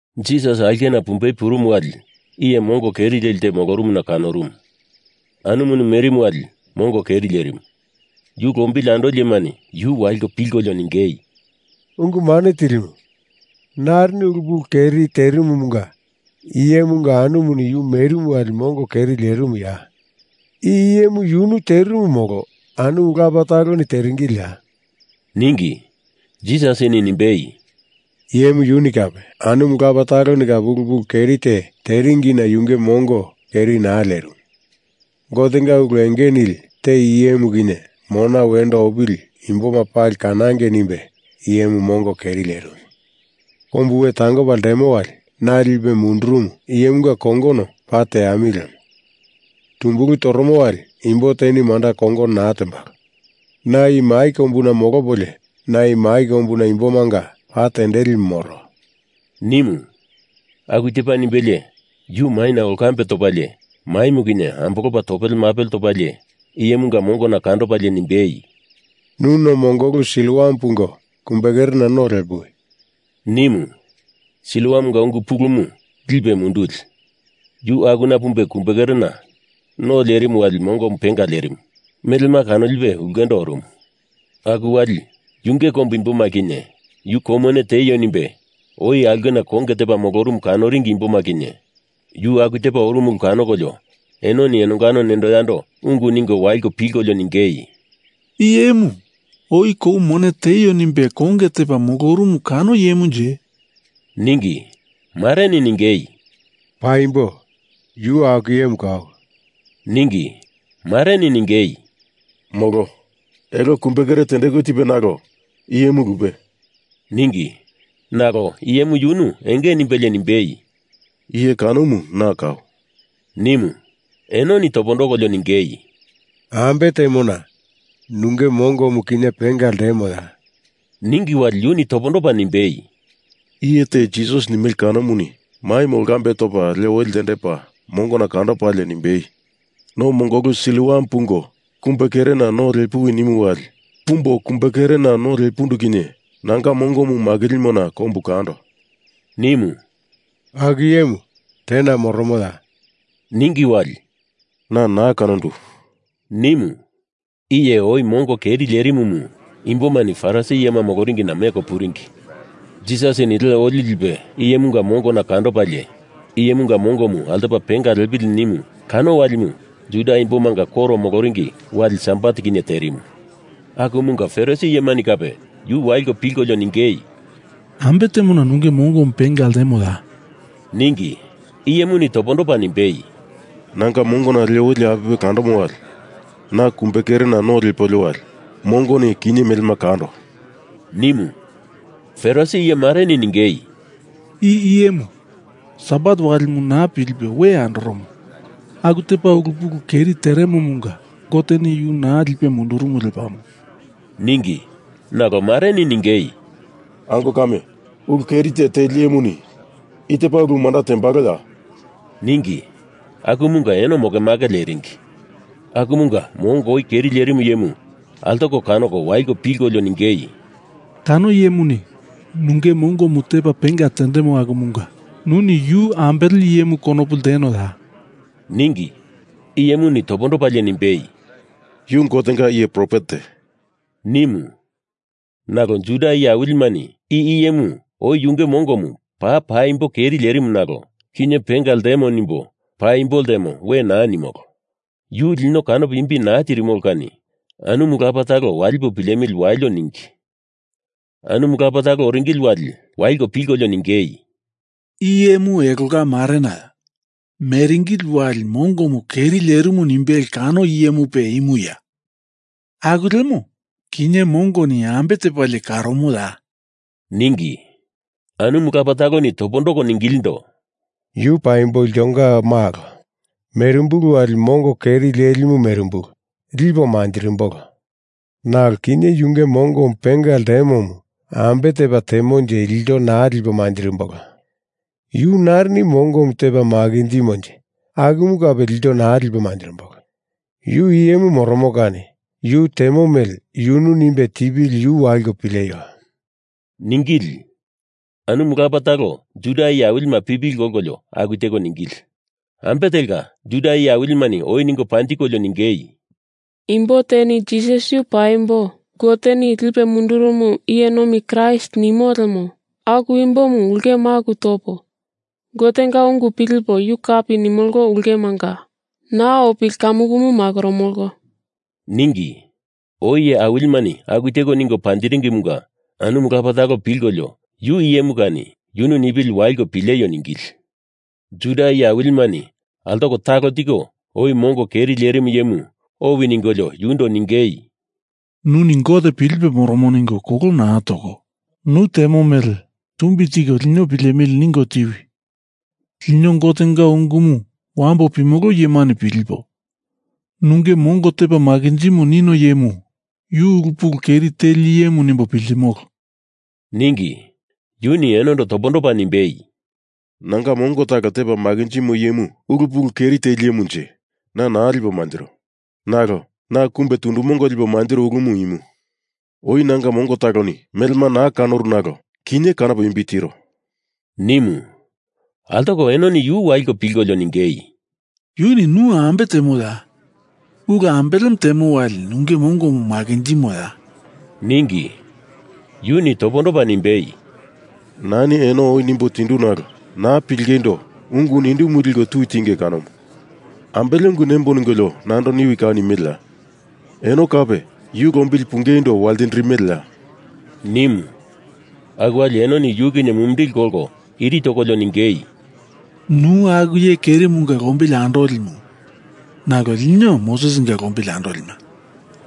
Jisas aulkena pumbei purumu wali iye mongo keri leli te molorumuna kanorumu. Anumuni merimu wali mongo keri lerimu. Yu lombili andoli iyemani yu waliko pilkolio ningei, “Ungu Mane Tilimu, narini ulu pulu keri terimumunga i iyemunga anumuni yu merimu wali mongo keri lerimuya? Iyemu yunu terimu molo anumu lapa taloni teringiliya?” ningi. Jisasini nimbei, “Iyemu yuni kape anumu lapa taloni kape ulu pulu keri te teringina yunge mongo keri naa lerimu. Gotenga ulu enge nili te i iyemu kinye mona wendo opili imboma pali kanangei nimbe i iyemu mongo keri lerimu. Kombu we tangopa ltemo wali na lipe mundurumu iyemunga kongono paa teamili lemo. Tumbulu toromo wali imbo teni manda kongono naa tembalo. Na i mai kombuna molopolio, na mai kombuna imbomanga pa tendelimu moro,” nimu. Aku tepa nimbelie yu maina olkambe topalie maimu kinye ambolopa topele mapele topalie iyemunga mongona kandopalie nimbei, “Nu no mongolu Siloam pungo kumbekerena no lepuwi,” nimu. Siloamunga ungu pulumu Lipe Munduli. Yu akuna pumbe kumbekerena no lerimu wali mongomu penga lerimu. Melema kanolipe ulkendo orumu. Aku wali yunge kombu imboma kinye yu kou mone tieio nimbe oi aulkena konge tepa molorumu kanoringi imboma kinye yu aku tepa orumu ulu kanokolio enoni enongano nendo yando ungu ningo waliko pilkolio ningei, “I iyemu oi kou mone tieio nimbe konge tepa molorumu kano iyemunje?” ningi. Mareni ningei, “Paimbo yu aku iyemu kau,” ningi. Mareni ningei, “Molo. Elo kumbekere tendeku tepa nalo i iyemu lupe,” ningi. Nalo iyemu yunu enge nimbelie nimbei, “Iye kanomu na kau,” nimu. Enoni topondokolio ningei, “Ambe temona nunge mongomu kinye penga ltemoya?” Ningi wali yuni topondopa nimbei, “Iye te Jisas nimele kanomuni maimu olkambe topa le oli ltendepa mongona kandopalie nimbei, no mongolu Siloam pungo kumbekerena no lepuwi nimu wali pumbo kumbekerena no lepundu kinye nanga mongomu makilimona kombu kando,” nimu. “Aku iyemu tena moromoya?” ningi wali “Na naa kanondu,” nimu. Iye oi mongo keri lerimumu imbomani Farisi iyema moloringina meko puringi. Jisasini le oli lipe iyemunga mongona kandopalie iyemunga mongomu altopa penga lepili nimu kano walimu Juda imboma koro moloringi wali Sabat kinye terimu. Akumunga Farisi iyemani kape yu waliko pilkolio ningei, “Ambe temona nunge mongomu penga ltemoya?” ningi. Iyemuni topondopa nimbei, “Nanga mongona le oli apipe kandomo wali na kumbekerena no lepolio wali mongoni kinye melema kando,” nimu. Farisi iye mareni ningei, “I iyemu Sabat walimu naa pilipe we andoromo, aku tepa ulu pulu keri teremomunga Goteni yu naa lipe mundurumu lepamo,” ningi. Nalo mareni ningei, “Ango kame, ulu keri te teli iyemuni i tepa ulu manda tembaloya?” ningi. Akumunga eno mokemake leringi. Akumunga mongo oi keri lerimu iyemu altoko kanoko waliko pilkolio ningei, “Kano iyemuni nunge mongomu tepa penga tendemo akumunga nuni yu ambele iyemu konopu ltenoya?” ningi. Iyemuni topondopalie nimbei, “Yu Gotenga iye profet te,” nimu. Nalo Juda iye awilimani i iyemu oi yunge mongomu paa paimbo keri lerimu nalo kinye penga ltemo nimbo paimbo ltemo we naa nimolo. Yu lino kanopo imbi naa tirimolo kani anumu lapa talo walipo pilemili walio ningi. Anumu lapa talo oringili wali, waliko pilkolio ningei, “I iyemu elonga marenaya? Meringili wali mongomu keri lerimu nimbele kano iyemupe imuya? Aku lemo, kinye mongoni ambe tepalie karomoya?” ningi. Anumu lapa taloni topondoko ningilindo, “Yu paimbo iltonga malo, merimbulu wali mongo keri lelimu merimbulu lipo manjirimbolo. Nalo kinye yunge mongomu penga ltemomu ambe tepa temonje ilto naa lipo manjirimbolo. Yu narini mongomu tepa makinjimonje akumu kape ilto naa lipo manjirimbolo. Yu iyemu moromo kani yu temo mele yunu nimbe tipili yu waliko pileio,” ningili. Anumu lapa talo Juda iye awilima pipili kolkolio aku teko ningili. Ambe telka, Juda iye awilimani oi ningo panjikolio ningei, “Imbo teni Jisas yu paimbo Goteni lipe mundurumu iye nomi Kraist nimo lemo aku imbomu ulke maku topo Gotenga ungu pilipo yu kapi nimolo ulkemanga naa opili kamukumu makoromolo,” ningi. Oi iye awilimani aku teko ningo panjiringimunga anumu lapa talo pilkolio yu iyemu kani yunu nipili waliko pileio ningili. Juda iye awilimani altoko talo tiko oi mongo keri lerimu iyemu owi ningolio yundo ningei, “Nuni Gote pilipe moromo ningo kolo naa toko, nu temo mele tumbi tiko lino pilemili ningo tiwi! Lino Gotenga ungumu wambo pimolo iyemani pilipo, nunge mongo tepa makinjimo nino iyemu yu ulu pulu keri teli iyemu nimbo piltimolo,” ningi. Yuni enondo topondopa nimbei, “Nanga mongo talo tepa makinjimo iyemu ulu pulu keri teli iyemunje, na naa lipo manjiro. Nalo na kumbe tundu mongo lipo manjiro ulu imu, oi na mongo taloni melema naa kanoru nalo kinye kanopo imbi tiro,” nimu. Altoko enoni yu waliko pilkolio ningei, “Yuni nu ambe temoya? Ulu ambelemu temo wali nunge mongomu makinjimoya?” ningi. Yuni topondopa nimbei, “Nani eno oi nimbo tindu nalo naa pilingeindo ungu nindumu liko tui tinge kanomu. Ambele ungu nemboi ningolio nando niwi kau nimeleya? Eno kape yu lombili pungeindo waltindirimeleya?” nimu. Aku wali enoni yu kinye mumindili kolko iri tokolio ningei, “Nu aku iye kerimunga lombili andolimu nalo lino Mosesinga lombili andolima.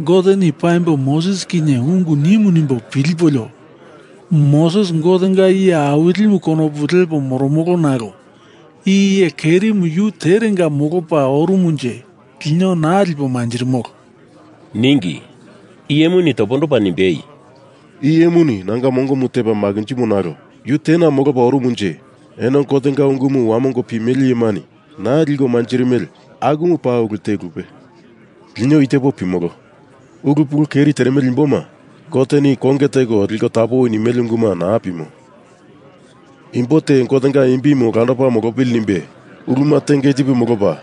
Goteni paimbo Moses kinye ungu nimu nimbo pilipolio Moses Gotenga iye awilimu konopu lepo moromolo nalo i iye kerimu yu terenga molopa orumunje lino naa lipo manjirimolo,” ningi. Iyemuni topondopa nimbei, “I iyemuni nanga mongomu tepa makinjimo nalo yu tena molopa orumunje eno Gotenga ungumu wamongo pimele iyemani naa liko manjirimele akumu paa ulu te lupe. Lino i tepo pimolo. Ulu pulu keri teremele imboma Goteni konge teko liko tapowi nimele unguma naa pimo. Imbo te Gotenga imbimu olandopa molopili nimbe uluma tenge tipe molopa,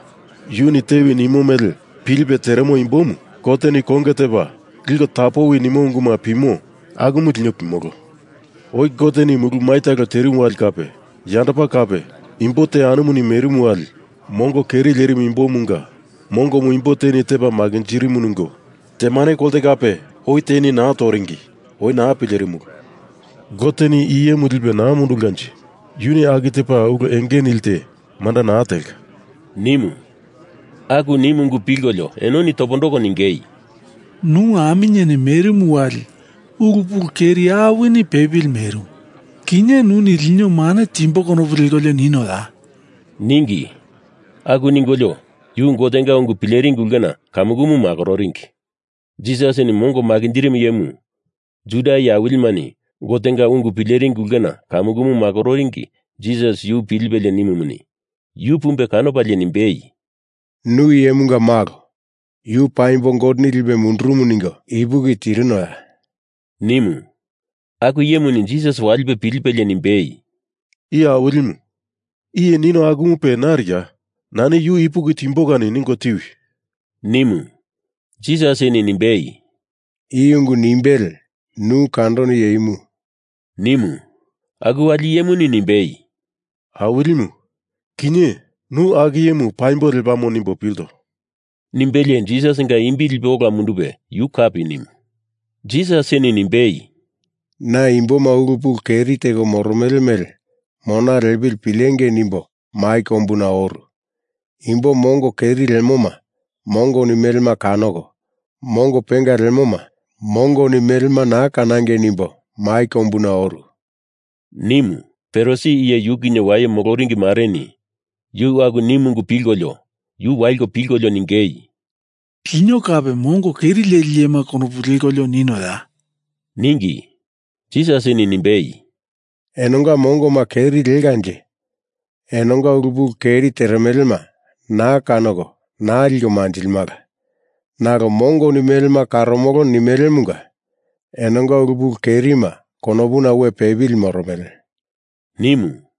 yuni tewi nimo mele pilipe teremo imbomu Goteni konge tepa liko tapowi nimo unguma pimo akumu lino pimolo. Oi Goteni mulu mai talo terimu wali kape yandopa kape imbo te anumuni merimu wali mongo keri lerimu imbomunga mongomu imbo teni tepa makinjirimu ningo temane kolte kape oi teni naa toringi, oi naa pilerimulu. Goteni i iyemu lipe naa mundulkanje yuni aku tepa ulu enge nili te manda naa telka,” nimu. Aku nimu ungu pilkolio enoni topondoko ningei, “Nu aminyeni merimu wali ulu pulu keri awini pepili merimu. Kinye nuni lino mane timbo konopu lekolio ninoya?” ningi. Aku ningolio yu Gotenga ungu pileringi ulkena kamukumu makororingi. Jisasini mongo makinjirimu iyemu Juda iye awilimani Gotenga ungu pileringi ulkena kamukumu makororingi Jisas yu pilipelie nimumuni, yu pumbe kanopalie nimbei, “Nu Iyemunga Malo Yu paimbo Goteni lipe mundurumu ningo ipuki tirinoya?” nimu. Aku iyemuni Jisas walipe pilipelie nimbei, “Iye Awilimu, iye nino akumupe nariya? Nani yu ipuki timbo kani ningo tiwi!” nimu. Jisasini nimbei, “I ungu nimbele nu kandono iye imu,” nimu. Aku wali iyemuni nimbei, “Awilimu, kinye nu aku iyemu paimbo lepamo nimbo pilto,” nimbelie Jisasinga imbi lipe ola mundupe yu kapi nimu. Jisasini nimbei, “Na imboma ulu pulu keri teko moromele mele mona lepili pilengei nimbo mai kombuna oru. Imbo mongo keri lemoma mongoni melema kanoko, mongo penga lemoma mongoni melema naa kanangei nimbo mai kombuna oru,” nimu Farisi iye yu kinye waye moloringi mareni yuni aku nimu ungu pilkolio yu waliko pilkolio ningei, “Lino kape mongo keri leli iyema konopu lekolio ninoya?” ningi. Jisasini nimbei, “Enonga mongoma keri lekanje enonga ulu pulu keri teremelema naa kanoko naa liko manjilimala. Nalo mongoni melema karomolo nimelemunga enonga ulu pulu kerima konopuna we pepili moromele,” nimu.